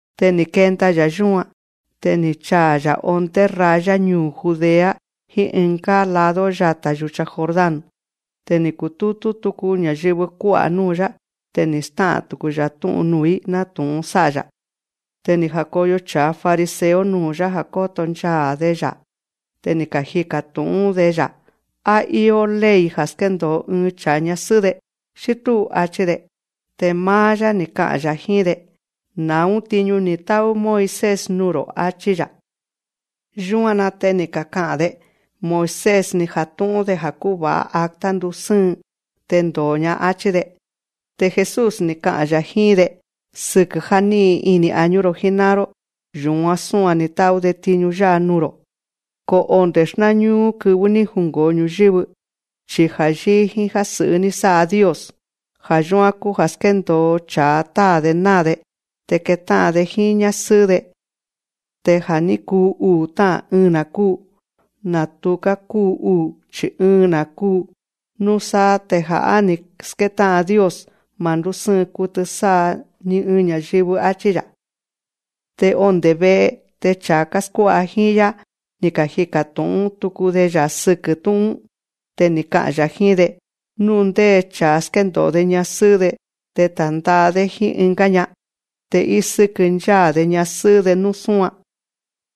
Te ni̱ kenda‑ya̱ yúan, te ni̱ chaa̱‑ya̱ ondé raya ñuu̱ Judea jíín ɨngá lado yata̱ yúcha Jordán. Te ni̱ kutútú tuku ña̱yɨvɨ kuá'a̱ núu̱‑yá. Te ni̱ stá'a̱n tuku‑ya̱ tú'un nuu̱‑í, nátu̱'un sá'a‑ya̱. Te ni̱ ja̱koyo cha̱a fariseo nuu̱‑yá ja̱ kóto nchaa̱‑de‑ya̱. Te ni̱ kajika̱ tu̱'ún‑de‑ya̱: Á íó ley ja̱ skéndo̱o ɨɨn cha̱a ñasɨ́'ɨ́‑de, xí túu, áchí‑de. Te máá‑yá, ni̱ ka'a̱n‑ya̱ jíín‑de: Na̱ún tiñu ni̱ tá'ú Moisés nuu̱‑ro̱, áchí‑ya̱. Yúan‑na te ni̱ kaka'a̱n‑de: Moisés, ni̱ jatu̱'un‑de ja̱ kúva̱'a acta ndusɨ́ɨn, te ndo̱o‑ña, áchí‑de. Te Jesús, ni̱ ka'a̱n‑ya̱ jíín‑de: Sɨkɨ já ní'in ini̱ añú‑ro̱ jíná'an‑ró, yu̱án súan ni̱ tá'ú‑de tiñu yá'a nuu̱‑ro̱. Ko onde̱ xnáñúú kɨvɨ́ ní jungo̱o ñu̱yɨ́vɨ, chi ja̱ yíí jíín já sɨ̱'ɨ́ ní sá'a Dios. Ja̱ yúán kúu ja̱ skéndo̱o cha̱a táa̱‑de náa̱‑de, te ketá'an‑de jíín ñásɨ́'ɨ́‑de. Te ja̱ ní kuu uu̱ tá'a̱n, ɨɨn‑na̱ kúu. Na̱ tuká kúu uu̱, chi̱ ɨɨn‑na̱ kúu. Núsáá te ja̱ á ni̱ skétá'an Dios, ma̱ ndúsɨ́ɨn kutɨ sá'a ɨɨn ña̱yɨvɨ, áchí‑ya̱. Te onde̱ ve'e te cha̱a káskuá'a jíín‑yá, ni̱ kajika̱ tu̱'ún tuku‑de‑ya̱ sɨkɨ́ tú'un‑ún. Te ni̱ ka'a̱n‑ya̱ jíín‑de: Nú ndé cha̱a skéndo̱o‑de ñasɨ́'ɨ́‑de te ta̱nda'a‑dé jíín ɨngá ña'an, te ísɨ́kɨ ncháa̱‑de ñasɨ́'ɨ́‑de nú súan.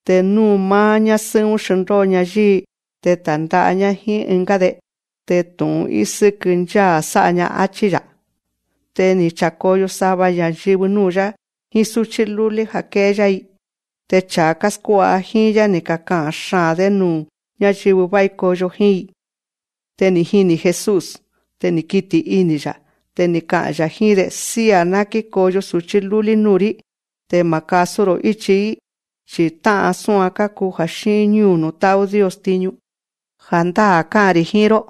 Te nú máá ñásɨ́'ɨ́‑ún xndóo‑ña yíi‑ñá te ta̱nda'a‑ñá jíín ɨngá‑de, te tu̱'un ísɨ́kɨ ncháa̱ sá'a‑ña. Achí‑ya̱. Te ni̱ cha̱koyo sava ña̱yɨvɨ núu̱‑yá jíín súchí lúlí ja̱ ké'é‑yá‑i. Te cha̱a káskuá'a jíín‑yá, ni̱ kaka'a̱n xaa̱n‑dé nuu̱ ñáyɨvɨ vái koyo jíín‑i. Te ni̱ jini̱ Jesús. Te ni̱ kiti̱ ini̱‑ya̱. Te ni̱ ka'a̱n‑ya̱ jíín‑de: Sía̱, ná kíkoyo su̱chí lúlí núu̱‑rí, te ma̱ kasú‑ro̱ íchi‑í, chi̱ tá'an súan kákuu ja̱ xíín ñúu̱ nuu̱ tá'ú Dios tiñu. Ja̱ndáa̱ ká'a̱n‑ri̱ jíín‑ró: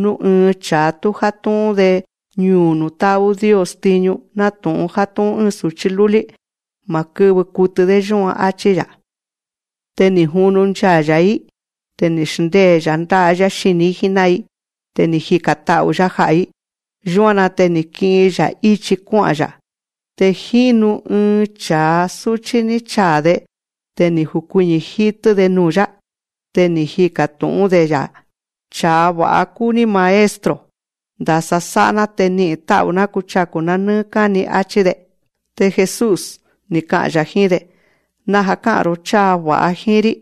Nú ɨɨn cha̱a tú játú'ún‑de ñuu̱ nuu̱ tá'ú Dios tiñu nátu̱'un játú'ún ɨ́ɨn su̱chí lúlí, ma̱ kɨ́vɨ kutɨ‑dé yúan, áchí‑ya̱. Te ni̱ junu nchaa̱‑ya̱‑í. Te ni̱ xndée‑ya̱ ndá'a‑yá xini̱‑í jíná'an‑i. Te ni̱ jika̱n ta'u̱‑yá ja'a̱‑í. Yúan‑na te ni̱ ki'in‑ya̱ íchi kuá'a̱n‑ya̱. Te jínu ɨɨn cha̱a súchí ni̱ chaa̱‑de. Te ni̱ jukuiñi̱ jítɨ́‑de nuu̱‑yá. Te ni̱ jika̱ tu̱'ún‑de‑ya̱: Cha̱a va̱'a kúu‑ní Maestro. Ndasa sá'a‑ná te ni'i̱n tá'u̱‑ná kuchaku̱‑ná nɨ́ɨ́ káni, áchí‑de. Te Jesús, ni̱ ka'a̱n‑ya̱ jíín‑de: Naja̱ ká'a̱n‑ro̱ cháa va̱'a jíín‑rí.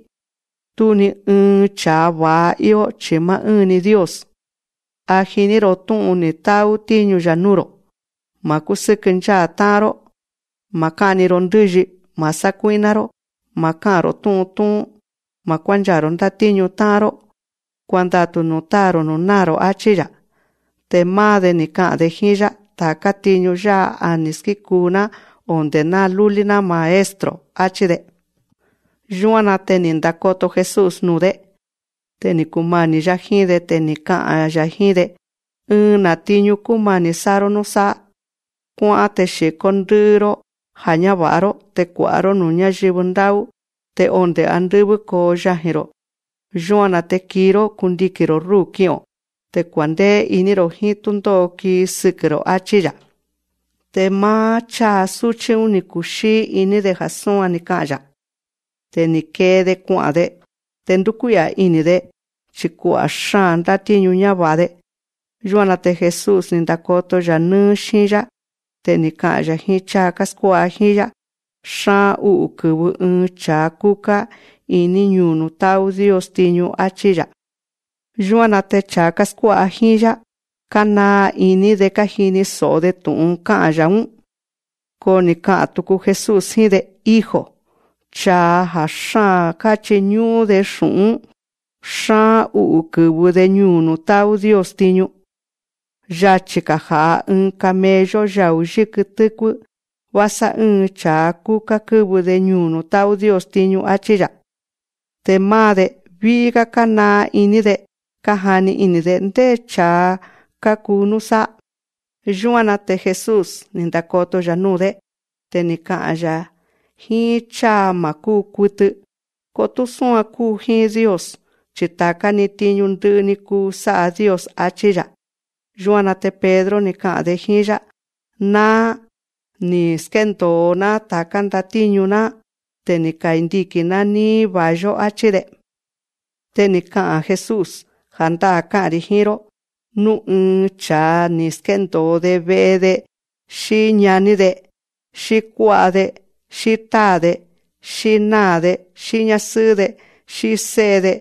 Tú ni ɨɨn cha̱a va̱'a íó chi̱ máá ɨ́ɨn‑ni Dios. A jiní‑ro̱ tú'un ni̱ tá'ú tíñu‑ya̱ núu̱‑ro̱: Ma̱ kúsɨ́kɨ ncháa̱ tá'an‑ró, ma̱ ká'ni‑ro ndɨ́yi, ma̱ sákuí'ná‑ró, ma̱ ká'a̱n‑ro̱ tú'un tú'ún, ma̱ kuánchaa̱‑ro̱ ndátíñu tá'an‑ró; kuandatu̱ nuu̱ táa̱‑ro̱ núu̱ náa̱‑ro̱, áchí‑ya̱. Te máá‑de, ni̱ ka'a̱n‑de jíín‑yá: Ta̱ká tiñu yá'a a ni̱ skíkuu‑ná onde̱ ná lúlí‑ná, Maestro, áchí‑de. Yúan‑na te ni̱ ndakoto Jesús nuu̱‑dé. Te ni̱ kumani̱‑yá jíín‑de. Te ni̱ ka'a̱n‑ya̱ jíín‑de: Ɨɨn‑na̱ tiñu kúmani̱ sá'a‑ró núsáá. Kuá'án, te xi̱kó ndɨ́'ɨ‑ró já ñáva̱'a‑ró, te kua̱'a‑ró núu̱ ñáyɨvɨ ndá'ú. Te onde̱ andɨ́vɨ́ kóo yaji̱‑ro̱. Yúan‑na te kii‑ró, kundiki̱n‑ro̱ rúu̱ ki'o̱n, te kua̱ndéé iní‑ro̱ jíín túndó'o kii sɨkɨ̱‑ro̱, áchí‑ya̱. Te máá cháa súchí‑ún, ni̱ kuxíí iní‑de ja̱ súan ni̱ ka'a̱n‑ya̱. Te ni̱ kee‑de kua'a̱n‑de. Te ndúkuí'a̱ ini̱‑de. Chi̱ kua'a̱ xáa̱n ndátíñu ñáva̱'a‑de. Yúan‑na te Jesús, ni̱ ndakoto‑ya̱ nɨ́ɨ́ xíin‑yá. Te ni̱ ka'a̱n‑ya̱ jíín cháa káskuá'a jíín‑yá: Xaa̱n ú'u̱ kɨ̱vɨ ɨɨn cha̱a kúká iní ñuu̱ nuu̱ tá'ú Dios tiñu, áchí‑ya̱. Yúan‑na te cha̱a káskuá'a jíín‑yá, kánaa iní‑de kájini so̱'o‑de tu̱'un ni̱ ka'a̱n‑ya̱‑ún. Ko ni̱ ka'a̱n tuku Jesús jíín‑de: Hijo, cha̱a ja̱ xáa̱n káchiñú'ún‑de xu̱'ún, xaa̱n ú'u̱ kɨ̱vɨ‑de ñuu̱ nuu̱ tá'ú Dios tiñu. Yachi̱‑ga̱ ja̱'a ɨɨn camello yau̱ yikɨ tɨ́kuɨ́, vásá ɨ́ɨn cha̱a ku̱ká kɨ́vɨ‑de ñuu̱ nuu̱ tá'ú Dios tiñu, áchí‑ya̱. Te máá‑de, ví'í‑gá kánaa iní‑de, kájani ini̱‑de: Ndé cha̱a ka̱ku núsáá. Yúan‑na te Jesús, ni̱ ndakoto‑ya̱ núu̱‑dé. Te ni̱ ka'a̱n‑ya̱: Jíín cháa ma̱ kúu kutɨ, ko tú súan kúu jíín Dios. Chi ta̱ká‑ni tiñu ndɨ'ɨ‑ni kúu sá'a Dios, áchí‑ya̱. Yúan‑na te Pedro, ni̱ ka'a̱n‑de jíín‑yá: Náá, ni̱ ka̱skéndo̱o‑ná ta̱ká ndatíñu‑ná. Te ni̱ kandiki̱n‑ná níí va̱i‑yó, áchí‑de. Te ni̱ ka'a̱n Jesús: Ja̱ndáa̱ ká'a̱n‑ri̱ jíín‑ró: Nú ɨɨn cha̱a ni̱ skéndo̱o‑de ve'e‑de, xí ñaní‑de, xí kuá'a‑de, xí táa̱‑de, xí náa̱‑de, xí ñásɨ́'ɨ́‑de, xí sé'e‑de,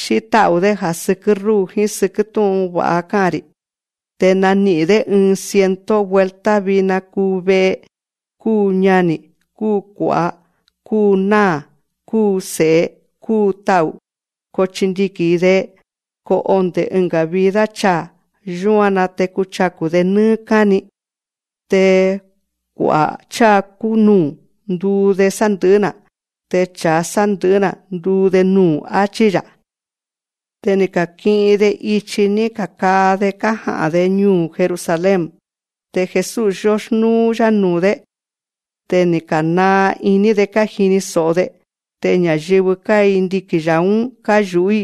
xí tá'u̱‑dé, ja̱ sɨkɨ́ rúu̱ jíín sɨkɨ́ tú'un va̱'a ká'a̱n‑ri̱, te nani'i̱n‑dé ɨɨn ciento vuelta vina kúu ve'e, kúu ñani̱, kúu kua̱'a, kúu náa̱, kúu se̱'e, kúu ta'u̱. Ko chindiki̱n‑i‑de. Ko onde̱ ɨnga̱ vida chaa̱, yúan‑na te kuchaku̱‑de nɨ́ɨ́ káni. Te kua'a̱ cháa kúnúú, nduu‑de sandɨ̱'ɨ́‑na̱. Te cha̱a sandɨ̱'ɨ́‑na̱, ndunúú‑de, áchí‑ya̱. Te ká'i̱in‑de ichi ní ka̱kaa‑de kája'a̱n‑de ñuu̱ Jerusalén. Te Jesús, yóxnúú‑yá nuu̱‑dé. Te ni̱ ka̱naa iní‑de kájini so̱'o‑de. Te ña̱yɨvɨ káindiki̱n‑ya̱‑ún káyu̱'ú‑i.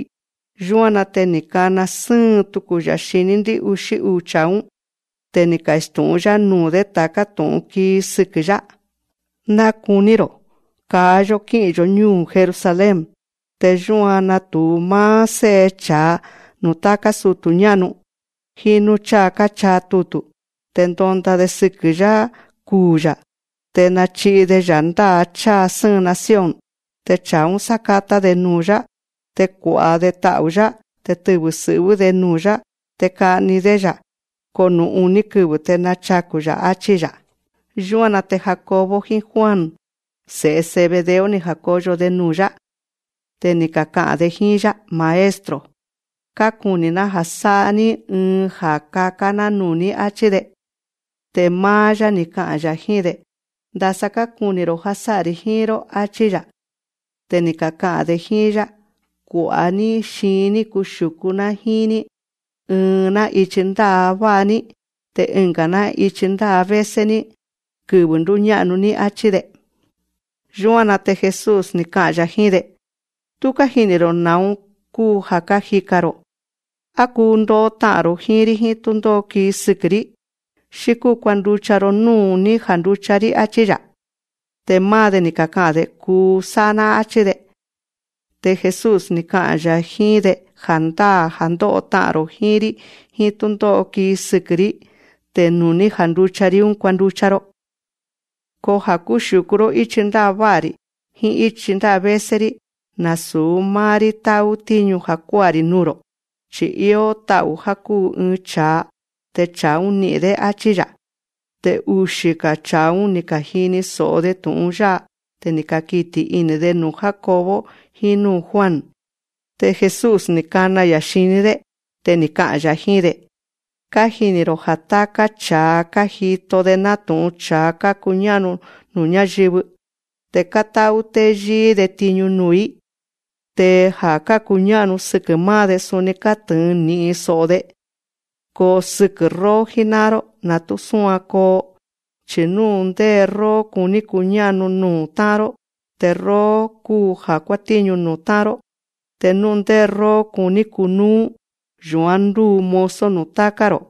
Yúan‑na te ni̱ kana sɨ́ɨn tuku‑ya̱ xiní ndɨ́'uxí uu̱ cha̱a‑ún. Te ni̱ kastu̱'ún‑yá nuu̱‑dé ta̱ká tu̱'un kii sɨkɨ̱‑yá: Ná kuní‑ro̱: Kaa‑yó kí'i̱n‑yo̱ ñúu̱ Jerusalén. Te yúan natu̱u máá Sé'e cha̱a nuu̱ táká sutu̱ ñá'nu, jíín núu̱ cháa káchaa tutu̱. Te ndonda‑de sɨkɨ̱‑yá kuu̱‑ya̱. Te nachi'i‑de‑ya̱ ndá'a cháa sɨ́ɨn nación. Te cha̱a‑ún, sákátá‑de nuu̱‑yá. Te kua̱'a‑de ta'u̱‑yá. Te tɨvɨ̱ sɨ̱'vɨ́‑de nuu̱‑yá. Te ka'ni‑dé‑ya̱. Ko nuu̱ uní kɨvɨ̱ te nachaku̱‑ya̱, áchí‑ya̱. Yúan‑na te Jacobo jíín Juan, se̱'e Zebedeo, ni̱ ja̱koyo‑de nuu̱‑yá. Te ni̱ kaka'a̱n‑de jíín‑yá: Maestro, kákuni̱‑ná ja̱ sá'a‑ní ɨɨn ja̱ kakán‑ná nuu̱‑ní, áchí‑de. Te máá‑yá, ni̱ ka'a̱n‑ya̱ jíín‑de: Ndasa kákuni̱‑ro̱ já sá'a‑ri̱ jíín‑ró, áchí‑ya̱. Te ni̱ kaka'a̱n‑de jíín‑yá: Kua̱'a‑ní xiin‑ní kuxiu̱kú‑ná jíín‑ní, ɨɨn‑ná ichi ndává'a‑ní, te ɨnga̱‑ná ichi ndávésé‑ní, kɨvɨ̱ ndúñá'nu‑ní, áchí‑de. Yúan‑na te Jesús, ni̱ ka'a̱n‑ya̱ jíín‑de: Tú kájini̱‑ro̱ na̱ún kúu ja̱ kájika̱n‑ro̱. Á kuu ndo'o ta'a̱n‑ro̱ jíín‑rí jíín túndó'o kii sɨkɨ̱‑rí, xí kúu kuanducha‑ro núu̱ ní janducha‑rí, áchí‑ya̱. Te máá‑de, ni̱ kaka'a̱n‑de: Kuu sá'a‑ná, áchí‑de. Te Jesús, ni̱ ka'a̱n‑ya̱ jíín‑de: Ja̱ndáa̱, ja̱ ndó'o ta'a̱n‑ro̱ jíín‑rí jíín túndó'o kii sɨkɨ̱‑rí, te nuu̱ ní janducha‑rí, kuanducha‑ro, ko ja̱ kúxiu̱kú‑ró íchi ndává'a‑ri̱ jíín íchi ndávésé‑rí, nasu̱ máá‑rí tá'ú tíñu ja̱ kuá'a‑ri̱ nuu̱‑ro̱, chi̱ íó tu̱'a ja̱ kúu ɨɨn cha̱a, te cha̱a‑ún ni'i̱n, áchí‑ya̱. Te uxi̱‑ga̱ cha̱a‑ún, ni̱ ka̱jini so̱'o‑de tu̱'un yá'a. Te ni̱ kakiti̱ ini̱‑de nuu̱ Jacobo jíín núu̱ Juan. Te Jesús, ni̱ kana‑ya̱ xiní‑dé. Te ni̱ ka'a̱n‑ya̱ jíín‑de: Kájini̱‑ro̱ já táká cha̱a kájito‑de nátu̱'un cha̱a kákuñá'nu nuu̱ ñáyɨvɨ, te kátá'ú téyíí‑de tiñu nuu̱‑í. Te ja̱ kákuñá'nu sɨkɨ̱ máá‑de, suni kátɨ̱ɨn ni̱'in so̱'o‑de. Ko sɨkɨ̱ róó jíná'an‑ró, na̱ tú súan koo: Chi̱ nú ndé róó kuní kuñá'nu nuu̱ tá'an‑ró, te róó kúu ja̱ kuátíñu nuu̱ tá'an‑ró. Te nú ndé róó kuní kunúú, yu̱án ndúu mozo nuu̱ táká‑ro̱.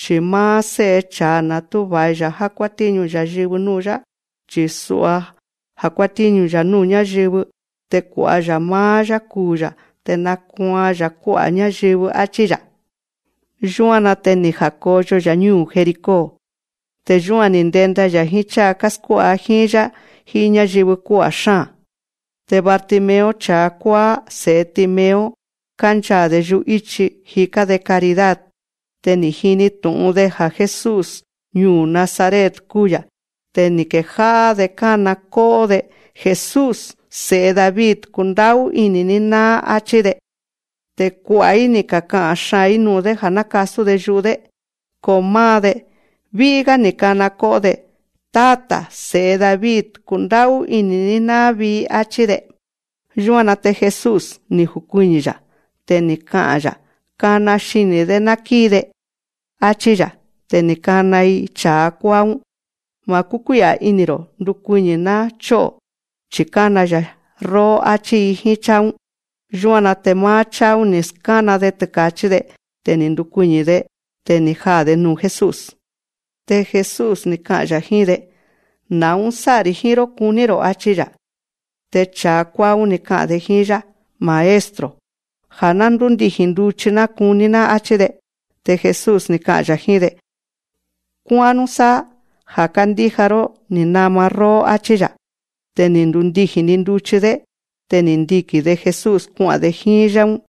Chi̱ máá Sé'e cha̱a na̱ tú va̱i‑ya̱ já kuátíñu ña̱yɨvɨ núu̱‑yá, chi̱ sua játíñu‑ya̱ núu̱ ñáyɨvɨ te kua̱'a‑ya̱ máá‑yá kuu̱‑ya̱ já nákuaan‑ya̱ kuá'a̱ ñáyɨvɨ, áchí‑ya̱. Yúan‑na te ni̱ ja̱koyo‑ya̱ ñúu̱ Jericó. Te yúan ni̱ ndenda‑ya̱ jíín cháa káskuá'a jíín‑yá jíín ñáyɨvɨ kuá'a̱ xáa̱n. Te Bartimeo cha̱a kuáá, se̱'e Timeo, kánchaa̱‑de yu'íchi, jikán‑de caridad. Te ni̱ jini tu̱'un‑de ja̱ Jesús ñuu̱ Nazaret kúu‑ya̱. Te ni̱ kejá'á‑de kána kó'ó‑de: Jesús, Se̱'e David, kundá'ú ini̱‑ní náá, áchí‑de. Te kua'a̱‑í, ni̱ kaka'a̱n xaa̱n‑í nuu̱‑dé, ja̱ ná kasú‑de yu'u‑dé. Ko máá‑de, ví'í‑gá ni̱ kana kó'ó‑de: Táta̱ Se̱'e David, kundá'ú ini̱‑ní náá vii̱, áchí‑de. Yúan‑na te Jesús, ni̱ jukuiñi̱‑ya̱. Te ni̱ ka'a̱n‑ya̱: Kana xini̱‑dé ná kíi‑de, áchí‑ya̱. Te ni̱ ka̱kana‑i cha̱a kuáá‑ún: Ma̱ ndúkuí'a̱ ini̱‑ro̱. Ndukuiñi̱ ná chó'o̱, chi̱ kána‑ya̱ róó, áchí‑i jíín cháa‑ún. Yúan‑na te máá cháa‑ún, ni̱ skána‑de tɨka̱chí‑de. Te ni̱ ndukuiñi̱‑de. Te ni̱ jaa̱‑de nuu̱ Jesús. Te Jesús, ni̱ ka'a̱n‑ya̱ jíín‑de: Na̱ún sá'a‑ri̱ jíín‑ró kuní‑ro̱, áchí‑ya̱. Te cha̱a kuáá‑ún, ni̱ ka'a̱n‑de jíín‑yá: Maestro, ja̱ ná ndúndiji̱n nduchi‑ná kuní‑ná, áchí‑de. Te Jesús, ni̱ ka'a̱n‑ya̱ jíín‑de: Kuá'án núsáá. Ja̱ kándíja‑ró ní nama róó, áchí‑ya̱. Te ni̱ ndundiji̱n‑ni nduchi‑dé. Te ni̱ ndiki̱n‑de Jesús kua'a̱n‑de ichi‑ún jíín‑yá.